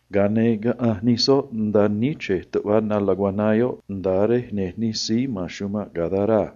Ga̱a ne̱ caꞌanj nij soꞌ nda̱a níchrej tuꞌva na laguaná yoꞌ, nda̱a rej ya̱nj nij síí “gadareno” a.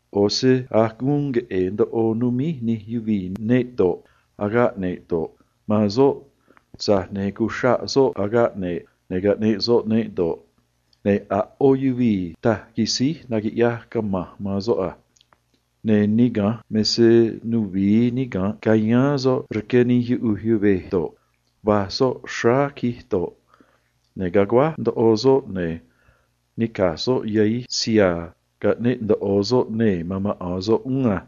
ꞌO̱ se a̱j guun queꞌe̱e̱ ndoꞌo numíj nij yuvii̱ neꞌ do̱ꞌ, agaꞌ ne̱ꞌ do̱ꞌ, man soꞌ, tza̱j ne̱ cuxraꞌ soꞌ agaꞌ ne̱ꞌ, ne̱ caꞌneꞌ soꞌ neꞌ do̱ꞌ, ne̱ a̱ ꞌó yuvii̱ taj quisíj naquiꞌyaj cama̱nj man soꞌ a. Ne̱ niga̱nj me se nuvi̱i niga̱nꞌ cayáán soꞌ rque nij yuꞌuj yuvej do̱ꞌ, va̱j soꞌ tacaan do̱ꞌ, ne̱ caguáj ndoꞌo soꞌ, ne̱ nica̱j soꞌ yahij siha̱a̱ caꞌneꞌ ndoꞌo soꞌ nee̱ man maꞌa̱n soꞌ uún a.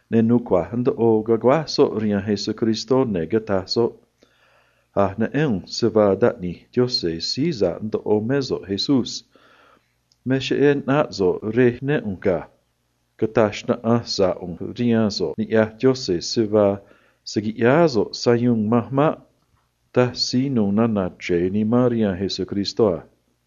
ne̱ nucua̱j ndoꞌo caguáj soꞌ rihaan Jesús, ne̱ cataj soꞌ a: ―A̱j neꞌén ꞌu̱nj se vaa Taꞌni̱j Yaꞌanj Si̱j Uun Chij Doj mé so̱ꞌ, Jesús. Me cheꞌé ꞌnáꞌ so̱ꞌ rej né ꞌu̱nj ga̱. Rqueé ꞌu̱nj man so̱ꞌ niꞌya̱j Yaꞌanj se vaa se̱ quiꞌyáá so̱ꞌ sayuun manj maꞌ ―taj síí nu̱u̱ nana̱ chre̱e nimán a.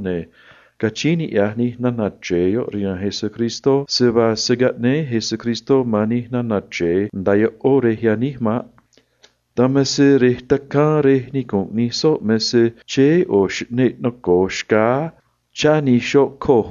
Ne̱ rquee̱ nij nana̱ chre̱e yoꞌ rihaan Jesús se vaa a̱ doj se̱ caꞌnéé Jesús man nij nana̱ chre̱e nda̱a ꞌó rej yaníj maꞌ. Dan me se rej tacaan rej nicu̱nꞌ nij soꞌ me se chéé ꞌo̱ xꞌneꞌ noco̱o xcáá, chá nij xoꞌ coj,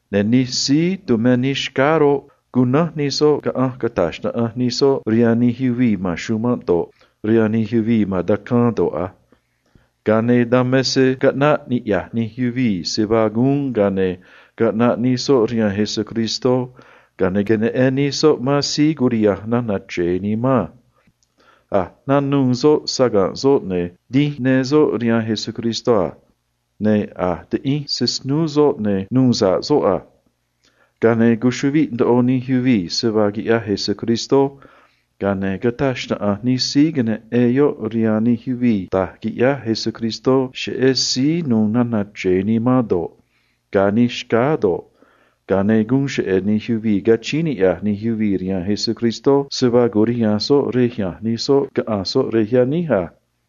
Ne̱ nij síí tumé nij xcáá roꞌ, cunánj nij soꞌ nataꞌ nij soꞌ rihaan nij yuvii̱ ma̱n chumanꞌ do̱ꞌ, rihaan nij yuvii̱ ma̱n tacaan do̱ꞌ a. Dan me se caꞌnaꞌ ni̱ꞌyaj nij yuvii̱ se vaa guun, ne̱ caꞌnaꞌ nij soꞌ rihaan Jesús, ne̱ queneꞌen nij soꞌ man síí curiha̱nj nana̱ chre̱e nimán a. A̱j nanuû soꞌ saga̱nꞌ soꞌ, ne̱ dínj ne soꞌ rihaan Jesús a. Ne̱ a̱j tiꞌinj se snúú soꞌ, ne̱ nuu sa̱ꞌ soꞌ a. Ga̱a ne̱ cuchuꞌviꞌ ndoꞌo nij yuvii̱ a. Ga̱a ne̱ nataꞌ nij síí queneꞌen yoꞌ rihaan ꞌó nij yuvii̱ da̱j quiꞌyaj Jesús cheꞌé síí cunuû nana̱ chre̱e nimán do̱ꞌ, da̱j quiranꞌ nij xcáá do̱ꞌ, ga̱a ne̱ guun cheꞌe̱ nij yuvii̱ rquee̱ nij yuvii̱ man Jesús se vaa cu̱riha̱nj soꞌ rej ya̱nj nij soꞌ caꞌa̱nj soꞌ rej yaníj a.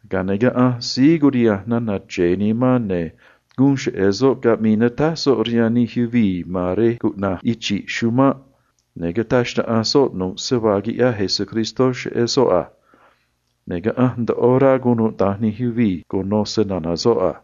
Ga̱a ne̱ caꞌanj síí curiha̱nj nana̱ chre̱e nimán, ne̱ guun cheꞌe̱ soꞌ caꞌmii natáj soꞌ rihaan nij yuvii̱ ma̱n rej cuꞌna̱j Chi̱ꞌ Chumanꞌ, ne̱ cataj xnaꞌanj soꞌ nu̱ꞌ rasu̱u̱n noco̱o quiꞌyaj Jesús cheꞌé soꞌ a. Ne̱ caꞌanj ndoꞌo rá cunuda̱nj nij yuvii̱ cuno snana̱ soꞌ a.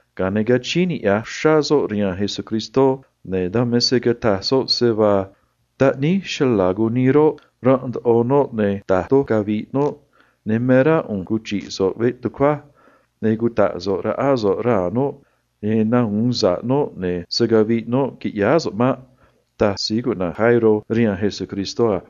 ga̱a ne̱ rquee̱ uxrá soꞌ man Jesús, ne̱ dan me se cataj soꞌ a: ―Taꞌníj chala̱ cunii roꞌ, ranꞌ ndoꞌo noꞌ, ne̱ da̱j doj cavi̱ꞌ noꞌ, ne̱ me rá ꞌu̱nj cuchi̱ꞌ so̱ꞌ veꞌ tucuaj, ne̱ cuta̱ꞌ so̱ꞌ raꞌá so̱ꞌ raa̱ noꞌ cheꞌé yan nahu̱un sa̱ꞌ noꞌ, ne̱ se̱ caviꞌ noꞌ, qui̱ꞌyáá so̱ꞌ maꞌ ―taj Jairo rihaan Jesús a.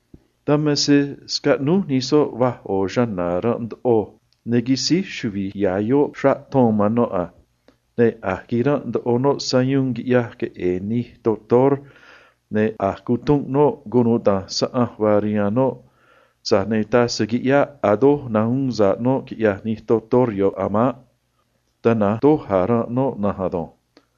Dan me se scaꞌnúj nij soꞌ va̱j ꞌo̱ chana̱ ranꞌ ndoꞌo, ne̱ quisíj chuvi̱j ya̱ yoꞌ xraꞌ ton man noꞌ a. Ne̱ a̱j quiranꞌ ndoꞌo noꞌ sayuun, quiꞌyaj queꞌe̱e̱ nij doctor naquiꞌyaj conoꞌó man yuvii̱, ne̱ a̱j cutunꞌ noꞌ cunuda̱nj saꞌanj vaa rihaan noꞌ, tza̱j ne̱ taj se quiꞌyáꞌ a̱ doj nahu̱un sa̱ꞌ noꞌ a̱ maꞌ. Tana̱nj doj a̱ ranꞌ noꞌ na̱nj ado̱nj.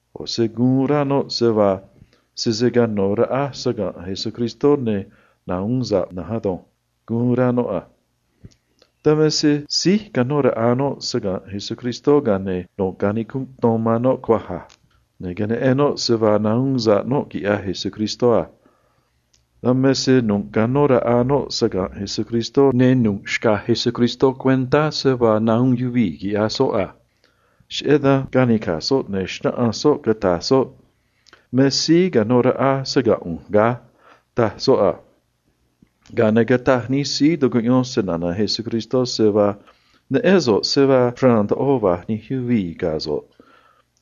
ꞌO̱ se guun rá noꞌ a: “Sese cano̱ raꞌa cuánꞌ ꞌu̱nj saga̱nꞌ Jesús, ne̱ nahu̱un sa̱ꞌ ꞌu̱nj na̱nj ado̱nj”, guun rá noꞌ a. Dan me se síj canó raꞌa noꞌ saga̱nꞌ Jesús, ga̱a ne̱ nu̱ꞌ canicunꞌ ton man noꞌ cuaj a. Ne̱ queneꞌen noꞌ se vaa nahuun sa̱ꞌ noꞌ, quiꞌyaj Jesús a. Dan me se nu̱ꞌ canó raꞌa noꞌ saga̱nꞌ Jesús, ne̱ nu̱ꞌ xcaj Jesús cuentá se vaa nahuun sa̱ꞌ yuvii̱ quiꞌyaj snucua̱j soꞌ a. Cheꞌé dan canica̱j soꞌ, ne̱ xnáꞌanj soꞌ a: ―Me síí canó raꞌa saga̱nꞌ ꞌu̱nj ga̱ ―taj soꞌ a. Ga̱a ne̱ cataj nij síí tucuꞌyón snana̱ Jesús a: ―Neꞌén so̱ꞌ se vaa xraan ndoꞌo va̱j nij yuvii̱ ga̱ so̱ꞌ,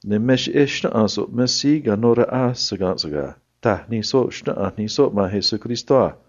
ne̱ me cheꞌé xnáꞌanj so̱ꞌ me síí canó raꞌa saga̱nꞌ so̱ꞌ ga̱ ―taj nij soꞌ a.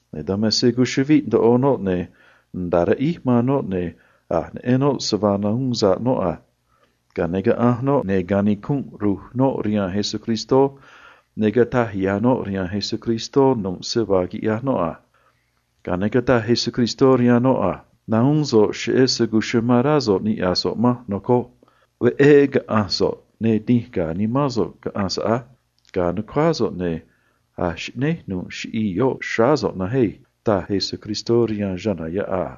Ne̱ dan me se cuchuꞌviꞌ ndoꞌo noꞌ ne̱ nda̱a riꞌíj man noꞌ, ne̱ a̱j neꞌen noꞌ se vaa nahuun sa̱ꞌ noꞌ a. Ga̱a ne̱ caꞌanj noꞌ, ne̱ quinij ru̱j noꞌ tacóó Jesús, ne̱ cataj ya̱ noꞌ rihaan Jesús nu̱ꞌ se vaa quiꞌyaj noꞌ a. Ga̱a ne̱ cataj Jesús rihaan noꞌ a: ―Nahuún so̱ꞌ cheꞌé se amán rá so̱ꞌ niꞌya̱j so̱ꞌ manj, nocoj. Veꞌé caꞌa̱nj so̱ꞌ, ne̱ dínj ga̱a̱ nimán so̱ꞌ á. Ga̱a̱ nu̱cuáá so̱ꞌ, cheꞌé se a̱j xꞌnéj nu̱ꞌ chiꞌii̱ yoꞌ xráá so̱ꞌ na̱nj á ―taj Jesús a.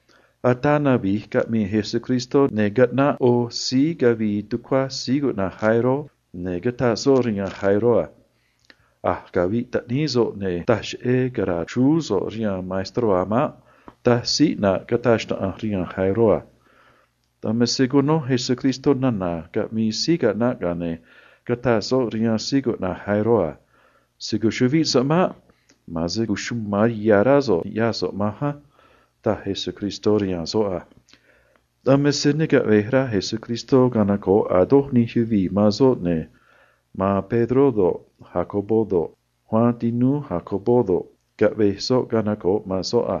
Ataa navi̱j caꞌmii Jesús, ne̱ caꞌnaꞌ ꞌo̱ síí cavii tucuá Jairo, ne̱ cataj soꞌ rihaan Jairo a: ―A̱j caviꞌ taꞌnij cha̱na̱ so̱ꞌ, ne̱ taj cheꞌé cara̱a̱ chrúú so̱ꞌ rihaan maestró a̱ maꞌ ―taj síí caꞌnaꞌ yoꞌ a. Dan me se cuno Jesús nana̱ caꞌmii síí caꞌnaꞌ, ga̱a ne̱ cataj soꞌ rihaan Jairo a: ―Se̱ cuchuꞌvíꞌ so̱ꞌ maꞌ. Ma̱an se cuchuma̱n ya̱ rá so̱ꞌ ni̱ꞌyaj so̱ꞌ manj á ―taj Jesús a. Dan me se ne caꞌve̱j rá Jesús canoco̱ꞌ a̱ doj nij yuvii̱ man soꞌ, ne̱ ma̱an Pedró do̱ꞌ, Jacobo do̱ꞌ, Juan tinúú Jacobo do̱ꞌ, caꞌvej soꞌ canoco̱ꞌ man soꞌ a.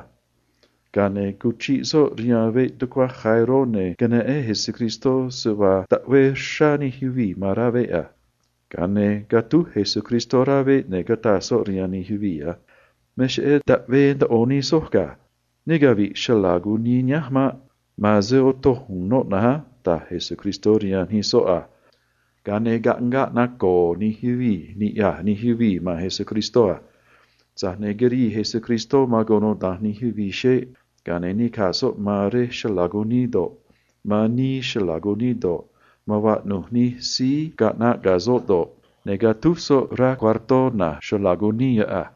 Ga̱a ne̱ cuchiꞌ soꞌ rihaan veꞌ tucuá Jairo, ne̱ queneꞌen Jesús se vaa taꞌvee aguáj nij yuvii̱ ma̱n rá veꞌ a. Ga̱a ne̱ catúj Jesús rá veꞌ, ne̱ cataj soꞌ rihaan nij yuvii̱ a: ―Me cheꞌé taꞌvee aguáj nij soj ga̱. Ne cavi̱ꞌ chala̱ cunii nihánj maꞌ. Ma̱an se otoj u̱u̱n noꞌ na̱nj á ―taj Jesús a. Ga̱a ne̱ caꞌngaꞌ naco̱o̱ nij yuvii̱ niꞌya̱j nij yuvii̱ man Jesús a. Tza̱j ne̱ quirii Jesús man cunuda̱nj nij yuvii̱ xeꞌ, ga̱a ne̱ nica̱j soꞌ man ro̱j rej chala̱ cunii do̱ꞌ, man vaꞌnu̱j nij síí caꞌnaꞌ ga̱ soꞌ do̱ꞌ, ne̱ catúj soꞌ rá cuartó na̱j chala̱ cunii yoꞌ a.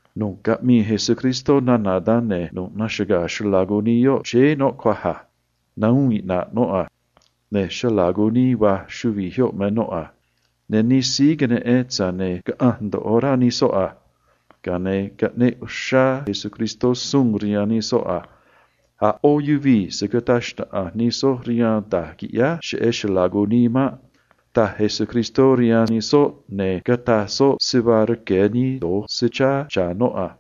Nu̱ꞌ caꞌmii Jesús nana̱ vaa da̱nj, ne̱ nu̱ꞌ naxaga̱a̱ chala̱ cunii yoꞌ, chéé noꞌ cuaj a. Ne̱ chuvi̱j yoꞌ va̱j noꞌ a. Ne̱ nij síí queneꞌen roꞌ, caꞌanj ndoꞌo rá nij soꞌ a. Ga̱a ne̱ caꞌneꞌ uxrá Jesús suun rihaan nij soꞌ a: ―A̱ ꞌó yuvii̱ se̱ cataj xnaꞌanj nij soj rihaan da̱j quiꞌyáj cheꞌé chala̱ cunii maꞌ ―taj Jesús a. Ne̱ cataj soꞌ se vaa rque̱ nii se chá cha̱ noꞌ a.